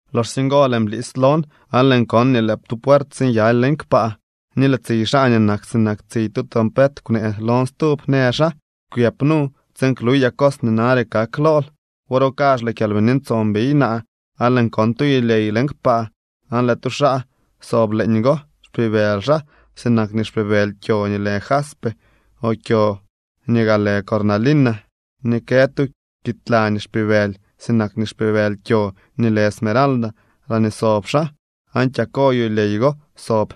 Loxsye ngo lëën blis lon aan lëën kon nii lëë tu puert sinyaly leñ kpaa. Ni lëë tsiy xaa nii nak sinak tsiy tu trompet kwnee lon stub. Në xaa: —Kwyëp nu tsiin kluyaa cos nii nare kak lool. Wor go kazh lëë Kyalbini Ntson biy naa aan lëën kon tu yulyey leñ kpaa aan lëë tu xaa sob leeñgo. Xpibëly xaa sinak nii xpibëly kyo nii lë jaspe o kyo nii gaa lë cornalina, ni kë tu kiidla nii xpibëly sinak nii xpibëly kyo nii lë esmeralda laañee sob xaa. Aan kyako yulyey go sob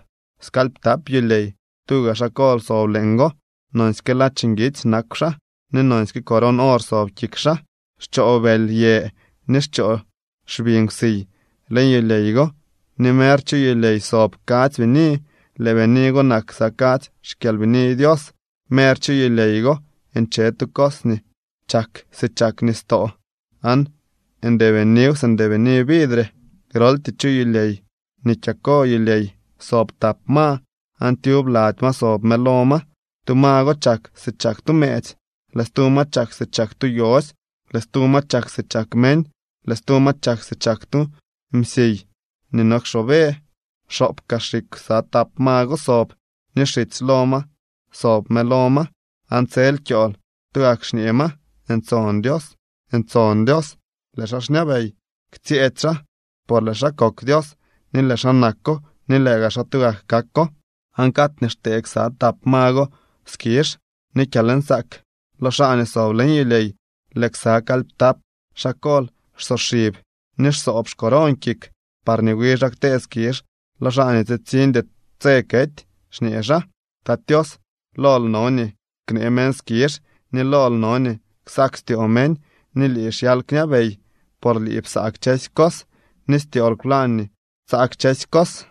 skalyptap yulyey, tuga xaa kol sob leeñgo, nonsyke ladx nguitsy nakw xaa ni nonsyke coron or sob kik xaa. Xchoo bëly yë ni xchoo xbi nkwsiy leñ yulyey go, ni mer chu yulyey sob kadzy bini, lëë bini go nak ksa kadzy xkyalbini Dios. Mer chu yulyey go nche tu cos nii chak si chak nistoo aan ndeebiniw si ndeebini vidre. Groltyee chu yulyey ni kyako yulyey sob tap ma aan tyub lady ma sob mëlo ma. Tu ma go chak si chak tu mëëtsy, lëë stu ma chak si chak tu yosy, lëë stu ma chak si chak meñ, lëë stu ma chak si chak tu msiy nii no kxoobe. Xoop kaa xikw ksa tap ma go sob ni xitsy lo ma sob mëlo ma, aan tsel kyool tugak xñee ma: Ntson Dios, ntson Dios, lëë xaa xñabey, ktsyëëdy xaa, por lëë xaa kok Dios, ni lëë xaa nako ni lëë gaa xaa tugak kako. Aan cad nii xtee ksa tap ma go skizh ni kyalnsaak lo xaa nii sob leñ yulyey, lëë ksa kalyptap xaa kol xsoxib ni xsoob xcoron kik, parñee wi xaa ktee skizh lo xaa nii tsitsiñdy tse kety, xñee xaa: Tat Tios, lool no nii knee meñ skizh ni lool no nii ksak styoo meñ ni lii xyal kñabey. Por lii psa kchësy cos, ni styool kwlañ nii tsaa kchësy cos.